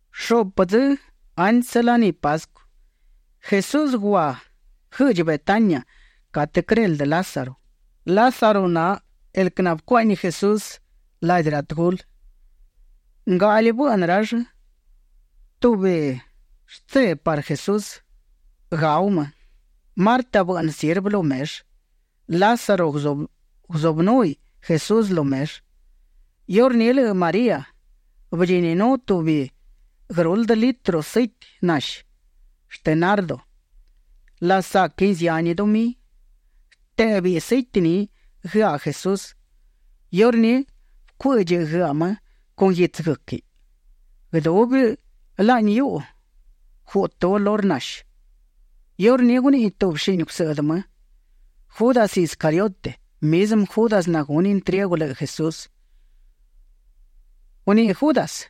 Shuꞌpë dzë antsë laní Pascu, Jesús gua guëꞌdchi Betania catë quëreldë Lázaro. Lázaro na el quë nabëcuaꞌñi Jesús ladi ra tëgulë. Ngaꞌli bëꞌnë rall tubi shtse parë Jesús, gau më. Marta bëꞌnë sirvë lu mellë. Lázaro guzubënúhiꞌ Jesús lu mellë. Iurní lëꞌë María bëdchininú tubi guëruldë litro sëiti nashi shtë nardo. Lasaquin zihani dumí. Bëtéꞌbëiꞌ sëiti ni guëaꞌ Jesús. Iurní bëcuë́ꞌdchiꞌ guëaꞌ më con guitsë guë́quiꞌ. Guëdubi laꞌni hiuꞌu guꞌtë olor nashi. Iurní guniꞌi tubi shini gusëꞌdë më, Judas Iscariote, mizmë Judas nagunë intriegu lëꞌë Jesús, guniꞌi Judas: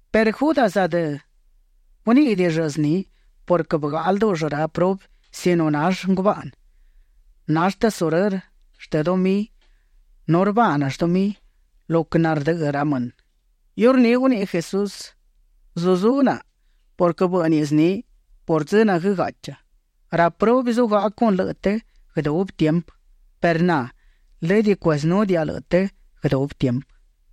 Perë Judas adë guníꞌidiꞌill zni purquë bëgaꞌa ldúꞌull ra prubi sino nall ngubaꞌnë. Nall tesurërë shtë dumí nu rbaaꞌnëll dumí lo quë nardëꞌë ra mënë. Iurní guniꞌi Jesús: ―Zuzú naꞌa purquë bë́ꞌniꞌ zniꞌi por dzë na guëgaꞌcha. Ra prubi zugaꞌa con lëꞌë të guëdubi tiempë perë na lëdë cuezënúdiaꞌa lëꞌë të guëdubi tiempë.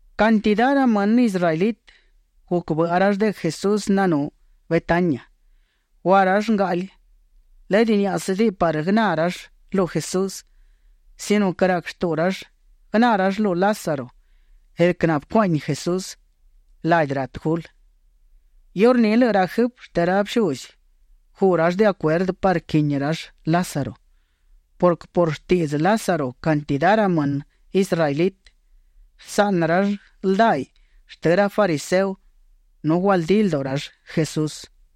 Cantidá ra më israelitë guc bëꞌa rall de quë Jesús nanú Betania. Gua rall ngaꞌli, lëdë niáꞌasëdiꞌi parë guëná rall lu Jesús sino quë rac shtuꞌu rall guëná rall lu Lázaro, el quë nabëcuaꞌñi Jesús ladi ra tëgulë. Iurní lëꞌë ra jëfë shtë ra bëshuzi guꞌ rall de acuerdë parë quini rall Lázaro purquë por shtiꞌdzë Lázaro cantidá ra mënë israelitë bësaꞌnë rall ldaiꞌ shtë ra fariseo nu gualdí lduꞌu rall Jesús.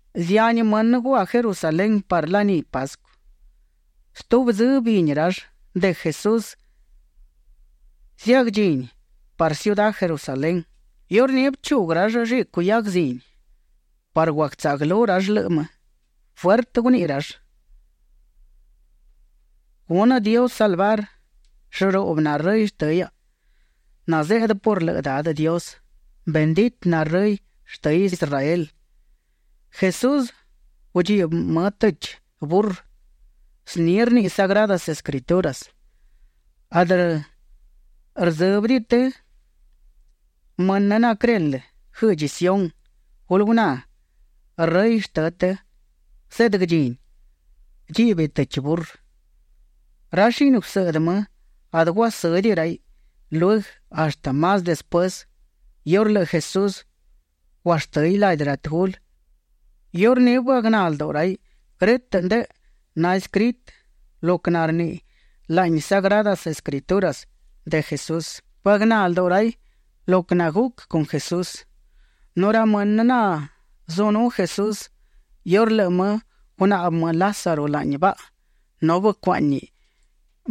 Zihani mënë gua Jerusalén parë laní Pascu. Stubi dzë bini rall de quë Jesús ziagdchini parë ciudá Jerusalén. Iurní bëchuguë rall llicu hiaguë zini parë guagtsaꞌguëlú rall lëꞌë më, fuertë guniꞌi rall: ―Gunë Dios salvar. Llëruꞌbë na Rëy shtë hiaꞌa nazeꞌdë por lë Dadë Dios. Benditë na Rëy shtë Israel. Jesús gudchibë më tëchi burrë. Zni rniꞌi Sagradas Escrituras: Adë rdzë́bëdiꞌi të, mënë naquëreldë guëꞌdchi Sión. Gulë guná Rëy shtënë të; zeꞌdë guëdchíniꞌ. Dchíꞌbiꞌ tëchi burrë. Ra shini gusëꞌdë më adë guasë́diꞌi raiꞌ lueguë; hashtë más despuësë iurë lëꞌë Jesús guashtë́hiꞌ ladi ra tëgulë, iurní bëagná lduꞌu raiꞌ grë́tëꞌ ndëꞌë naescritë lo quë narniꞌi laꞌni Sagradas Escrituras shcuendë Jesús. Bëagná lduꞌu raiꞌ lo quë naguc con Jesús. Nu ra mënë nazunú Jesús iurë lëꞌë më gunaꞌbë më Lázaro laꞌni baꞌa nu bëcuaꞌñi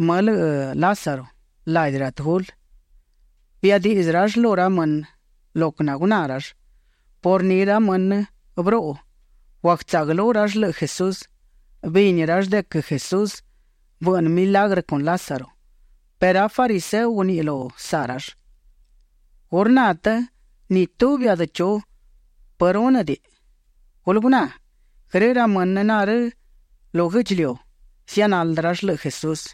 më lëꞌë Lázaro ladi ra tëgulë, biadiꞌdzë rall lu ra mënë lo quë naguná rall. Por ni ra mënë bëruꞌu; guagtsaꞌguëlú rall lëꞌë Jesús. Bini rall de quë Jesús bëꞌnë milagrë con Lázaro perë ra fariseo guniꞌi lu saꞌ rall: ―¿Gu rna të ni tubi adë chu pë rúnëdiꞌi? Gulë guná, grë ra mënë narë́ lu guë́ꞌdchiliu, zianaldë rall lëꞌë Jesús.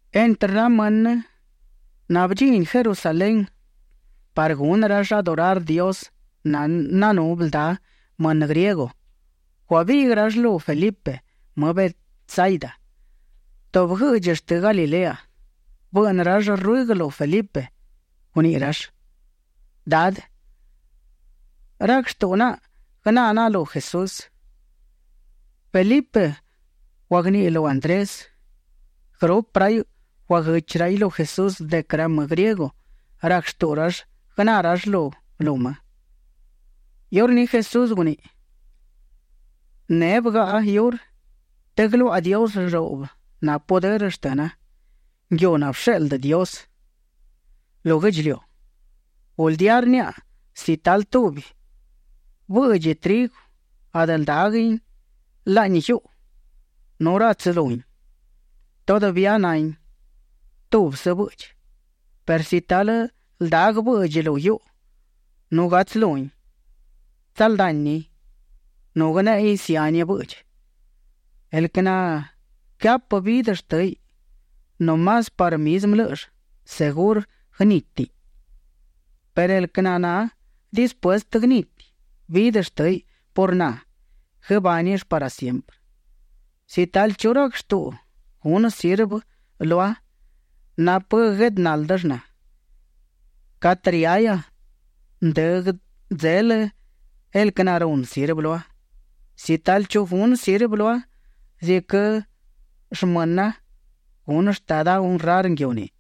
Entrë ra mënë nabëdchini Jerusalén parë gunë rall adorar Dios, nanú bëldá mënë griego. Guabiꞌguë rall lu Felipe më Betsaida, tubi guëꞌdchi shtë Galilea. Bëꞌnë rall ruëguë lu Felipe; guniꞌi rall: ―Dadë, rac shtuꞌu naꞌa guëná naꞌa lu Jesús. Felipe guagniꞌi lu Andrés. Guërupë raiꞌ guaguëchi raiꞌ lu Jesús de quë ra më griego rac shtuꞌu rall guëná rall lu më. Iurní Jesús guniꞌi: ―Neꞌ bëgaꞌa iurë të guëluaꞌa Dios llëruꞌbë na pudërë shtëna, nguiu nabësheꞌldë Dios lu guë́ꞌdchiliu. Guldía rniaꞌa, si talë tubi bëꞌdchi trigu adë ldáguëdiꞌin laꞌni guiuꞌu nu ratsu luhin, todavía nahin tubsë bëꞌdchi, perë si talë ldaguë bëꞌdchi lu guiuꞌu nu gatsu luhin, tsaldanin nu guëneꞌein zihani bëꞌdchi. El quë naquëhapë vidë shtë́niꞌ no más parë mizmë lë́ꞌëll, segurë guënitin, perë el quë naná dispuestë guëniti vidë shtë́niꞌ por na, guëbánill parë siemprë. Si talë chu rac shtuꞌu gunë sirvë lua, napë quë gueꞌdë náldëll na. Catë riahia, ndë guëdzelë el quë narunë sirvë lua. Si talë chu gunë sirvë lua ziquë shmëna, gunë Shtada honrar nguiu ni.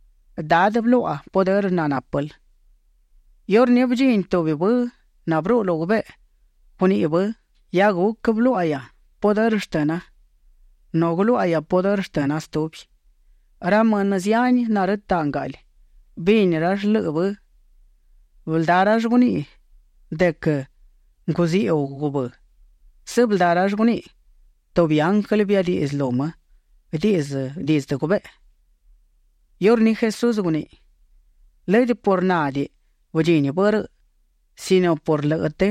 Dadë, bëluaꞌa pudërë nanápël. Iurní bëdchini tubi bë nabëruꞌu lu gubeꞌe. Guniꞌi bë: ―Hia guc bëluáꞌahia pudërë shtëna, nu guëluáꞌahia pudërë shtëna stubi. Ra mënë zihani narëtaꞌ ngaꞌli, bini rall lëꞌë bë. Bëldá rall guniꞌi de quë nguziꞌu gubë́. Sëbëldá rall guniꞌi: ―Tubi ianglë biadiꞌdzë lu më dizdë gubeꞌe. Iurní Jesús guniꞌi: ―Lëdë por nádiꞌi bëdchini bë rëꞌ sino por lëꞌë të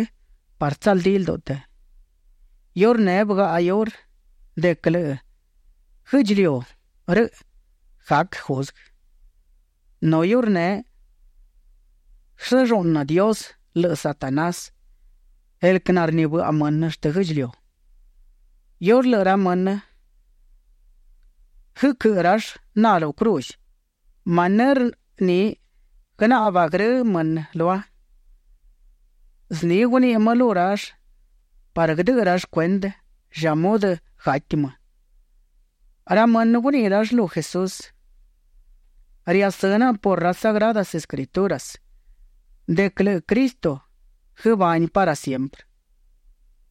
parë tsaldí lduꞌu të. Iurneꞌ bëgaꞌa iurë de quë lëꞌë guë́ꞌdchiliu rëꞌ gac juzguë. Nu iurneꞌ guësëlluꞌnë Dios lëꞌë Satanás, el quë narnibëꞌa mënë shtë guë́ꞌdchiliu. Iurë lëꞌë ra mënë guëquëꞌë rall na lu cruz, manërë ni guënaꞌba grë ra mënë lua. Zni guniꞌi më lu rall parë guëdëꞌë rall cuendë lla mudë gati më. Ra mënë guniꞌi rall lu Jesús: ―Riasë́ naꞌa por ra Sagradas Escrituras de quë lëꞌë Cristo guëbániꞌ parë siemprë.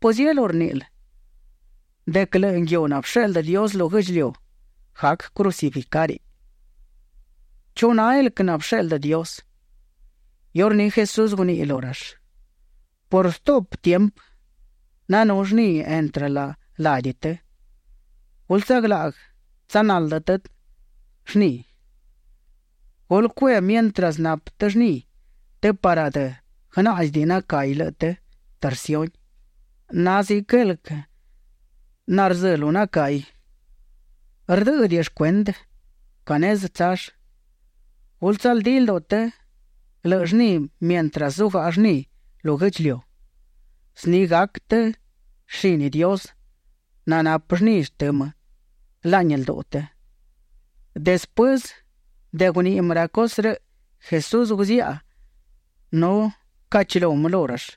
¿Pëzielú rníꞌil de quë lëꞌë nguiu nabësheꞌldë Dios lu guë́ꞌdchiliu, gac crucificáriꞌ? ¿Chu na el quë nabësheꞌldë Dios? Iurní Jesús guniꞌi lu rall: ―Por stuꞌpë tiempë nanú llni entrë ladi të. Gulë tsaglaꞌguë tsanaldë të llni. Gulë cue mientras napë të llni të parë adë guënáꞌzidiꞌi nacahi lëꞌë të terciuni. Na ziquë el quë narzë́ lu nacahi; rdë́ꞌëdiꞌill cuendë ca nezë tsall. Gulë tsaldí lduꞌu të lëꞌë llni mientras zugaꞌa llni lu guë́ꞌdchiliu. Zni gac të shini Dios nanapë llni shtë më laꞌni lduꞌu të. Despuësë de guniꞌi më ra cusë rëꞌ, Jesús guziaꞌa nu bëcaꞌchilú më lu rall.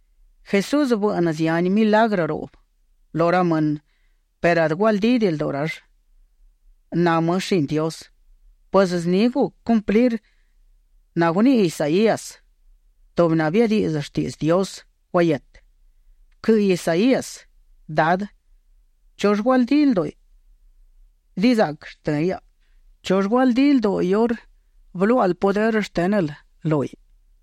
Jesús bëꞌnë zihani milagrë ruꞌbë lu ra mënë perë adë gualdídiꞌi lduꞌu rall na më shini Dios. Pues zni guc cumplir naguniꞌi Isaías, tubi nabiadiꞌdzë shtiꞌdzë Dios guahietë. Bëquëꞌë Isaías: Dadë, ¿chull gualdí lduꞌu dizaꞌquë shtë hiaꞌa? ¿Chull gualdí lduꞌu iurë bëluáꞌal pudërë shtë́nël lúhiꞌ?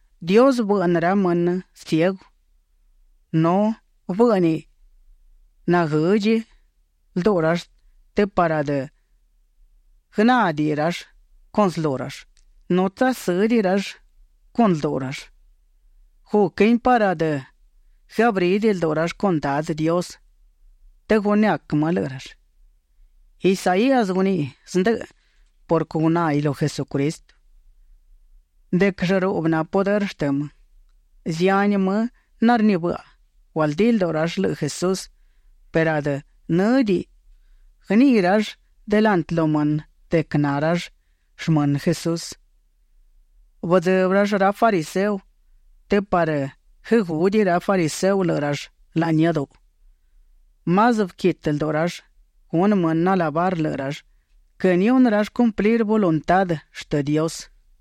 Dios bëꞌnë ra mënë ciegu nu bë́ꞌniꞌ naguëdchi lduꞌu rall të parë adë guënádiꞌi rall con slull, nu tsasë́diꞌi rall con lduꞌu rall. Guquin parë adë guëabrídiꞌi lduꞌu rall con Dadë Dios të gunëac më lëꞌë rall. Isaías guniꞌi zndëꞌë purquë gunáhiꞌ lu Jesucristo de quë llëruꞌbë na pudërë shtë më. Zihani më narnibëꞌa, gualdí lduꞌu rall lëꞌë Jesús perë adë në́diꞌi guëniꞌi rall delantë lu mënë de quë na rall shmënë Jesús. Bëdzëbë rall ra fariseo të parë guëgúdiꞌi ra fariseo lëꞌë rall laꞌni iáduꞌu. Más bëquitë lduꞌu rall gunë mënë alabar lëꞌë rall quë nihunë rall cumplir voluntá shtë Dios.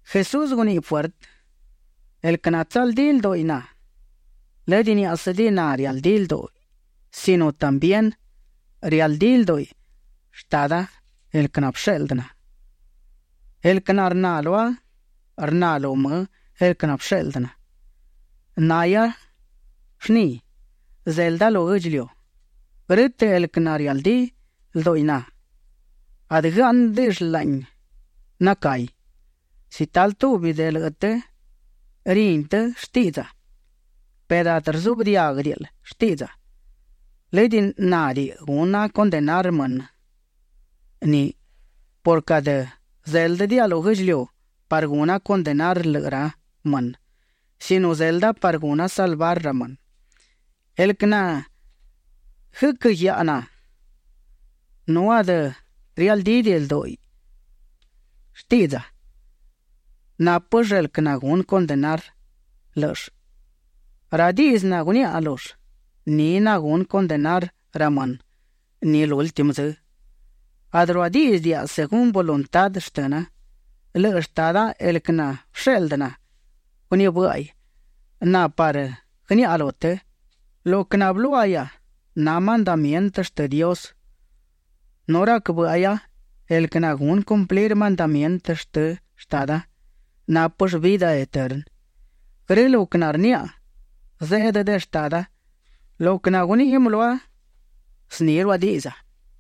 Jesús guniꞌi fuertë: ―El quë natsaldí lduꞌi na, lëdë niáꞌasëdiꞌi na rialdí lduꞌi sino también rialdí lduꞌi Shtada el quë nabësheꞌldë na. El quë narná lua, rna lu më el quë nabësheꞌldë na. Nahia llni. Zelda lu guë́ꞌdchiliu. Grë́tëꞌ el quë narialdí lduꞌi na, adë guëáꞌnëdiꞌill laꞌni nacahi. Si talë tubi de lëꞌë të rini të shtiꞌdza, perë adë rzuꞌbë diáguëdiꞌil shtiꞌdza, lëdë nádiꞌi guna condenar mënë ni purquë adë zéldëdiaꞌa lu guë́ꞌdchiliu parë guna condenar lëꞌë ra mënë sino zelda parë guna salvar ra mënë. El quë naguëquë́ guiaꞌa na nu adë rialdídiꞌi lduꞌu shtiꞌdza, nápëll el quë nagunë condenar lë́ꞌëll. Ra diꞌdzë naguniaꞌa lull, ni nagunë condenar ra mënë ni lúltimë dzë. Adë ruadíꞌdzëdiaꞌa según voluntá shtëna; lëꞌë Shtada el quë nabësheꞌldë na, gunibë́ꞌaiꞌ na parë guëniaꞌa lu të. Lo quë nabëluáꞌahia, na mandamientë shtë Dios. Nu rac bë́ꞌahia el quë nagunë cumplir mandamientë shtë Shtada, nápëll vidë eternë. Grë lo quë narniaꞌa, zeꞌdë de Shtada; lo quë naguniꞌi më lua, zni ruadiꞌdza.